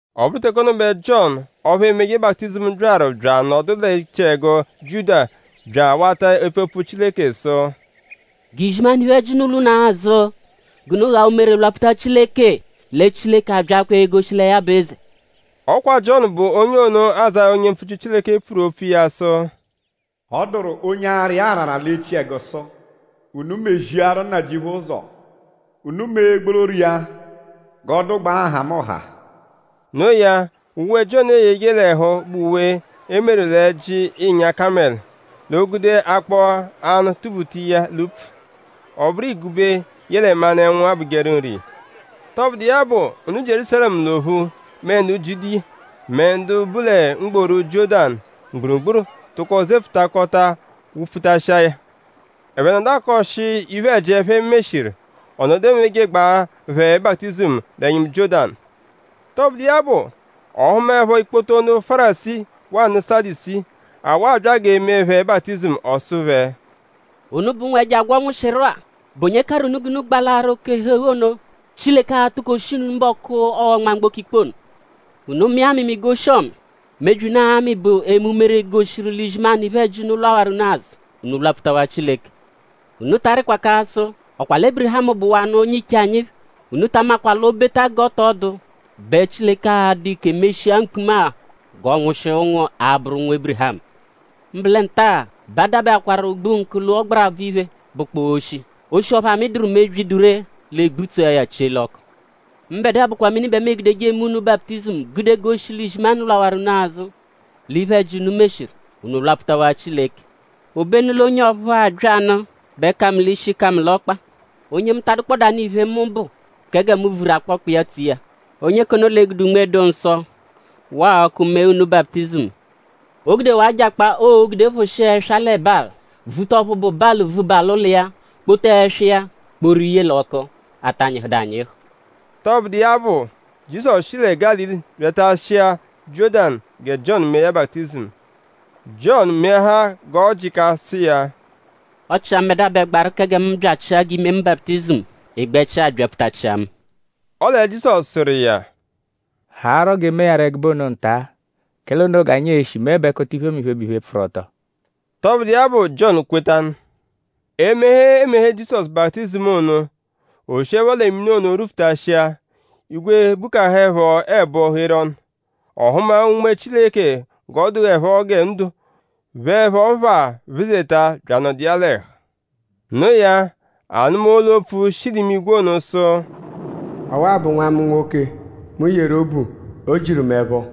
Ọ bụru teke ono bẹ Jiọnu ọphu emeje baputizimu byaru bya anọdu l'echiẹgu Jiudiya bya awata epfu opfu Chileke sụ: “G'izimanụ iphe-ẹji unu lwa unu azụ g'unu ghaa umere lwapfuta Chileke lẹ Chileke abyaakwaa egoshi lẹ ya bụ eze.” Ọ kwa Jiọnu bụ onye ono, Azáya, onye mpfuchiru Chileke pfuru opfu iya sụ: “Ọ dụru onye ara iya arara l'echiẹgu sụ: ‘Unu meziaru Nnajịuphu ụzo. Unu mee gbororo iya g'ọ dụgbaa nhamụnha.’” Noo ya; uwe, Jiọnu eyeje l'ẹhu bụ uwe, e meru l'ẹ́jí ịnya-kamẹlu; l'o gude akpọ-anụ tubuta iya l'upfu. Ọ bụru igube yẹle manụ-ẹnwu abụjeru nri iya. Tọbudu iya bụ; ndu Jierúsalẹmu l'ophu; mẹ ndu Jiudiya; mẹ ndu bu lẹ mgboru Jiọ́danu mgburugburu tụko zefụtakota wụ-pfutashia ya. Ẹphe nọdu akọshi iphe-ẹji, ẹphe meshiru; ọ nọdu emejegbaa phẹ baputizimu l'ẹnyimu Jiọ́danu. Tọbudu iya bụ; ọ hụmaepho ikpoto ndu Fárisii waa ndu Sadusii, awụ abya g'e mee phẹ baputizimu; ọ sụ phẹ: “Unubẹ ụnwu, ẹjo agwọ nwụshiru-a.?Bụ onye karụ unu g'unu gbalaaru oke-ẹhu-eghu ono, Chileke a-tukoshi unu mbọku, ọo-nma mgboko ikpe ono? Unu mịa amịmi g'oshi-ọmi. Mebyi, unu aa-mị bụ eme umere, goshiru l'izimanụ iphe-ẹji unu lwawaru unu azụ; unu lwapfutawaa Chileke. Unu ta arịkwa k'asụ: ‘?Ọ kwa lẹ Ébirihamu bụwanu onye-iche anyi phẹ.’ Unu ta amakwa l'o -beta g'ọ tọ dụ bẹ Chileke a-dụ ike meshia mkpuma-a g'ọ nwụshia ụnwu, a-bụru ụnwu Ébirihamu. Mbụ lẹ nta-a bẹ a dabẹakwaru ogbunkụ l'ọgbarabvu iphe, bụkpoo oshi. Oshi ọphu amịduru mebyi, dụ ree; l'ee-gbutsua ya chie l'ọku. Mbẹdua bụkwa mini bẹ mu egudeje eme unu baputizimu gude goshi l'izimanụ lwarụ unu azụ l'iphe-ẹji, unu meshiru; unu lwapfutawaa Chileke. Obenu l'onye ọphu abyanụ bẹ ka mu l'ishi ka mu l'ọkpa. Onye mu ta adụkpodanu iphe, mu bụ kẹ gẹ mu vuru akpọkpa iya tso iya. Onye k'ono l'e-gude Unme-dụ-Nsọ waa ọku mee unu baputizimu. O gudewaa ajakpa, oo-gude phụshia ẹswa lẹ balị; vuta ọphu bụ balị vuba l'ụlo iya; kpota ẹswa iya kporu ye l'ọku, ata nyịhudu anyịhu.” Tọbudu iya bụ; Jizọsu shi lẹ Gálili byatashia Jiọ́danu gẹ Jiọnu mee ya baputizimu. Jiọnu meahaa g'ọ jịka sụ iya: “Ọ chia mbẹdua bẹ gbaru kẹ gẹ mu byachia g'i mee mu baputizimu; ị gbẹchia abyapfutachịa mu.” Ọle Jizọsu sụru iya: “Haarọ g'e mee ya rọ ẹgube ono nta; kẹle ono g'anyi e-shi meẹbekota iphemiphe, bụ iphe, pfụru-ọto.” Tọbudu iya bụ; Jiọnu kwetanụ. Emeghe, eemeghe Jizọsu baputizimu ono; o shiẹpho lẹ mini ono rwufutashia; igwe bukahaẹpho ẹbo gheru ọnu. Ọ hụma Unme Chileke g'ọ dụepho gẹ ndo pheẹpho phaa phezeta bya anọdu iya l'ẹhu. Noo ya; a nụma olu-opfu, shi l'imigwe ono sụ: “Ọwa-a bụ Nwa mu nwoke, mu yeru obu. O jiru mu ẹpho.”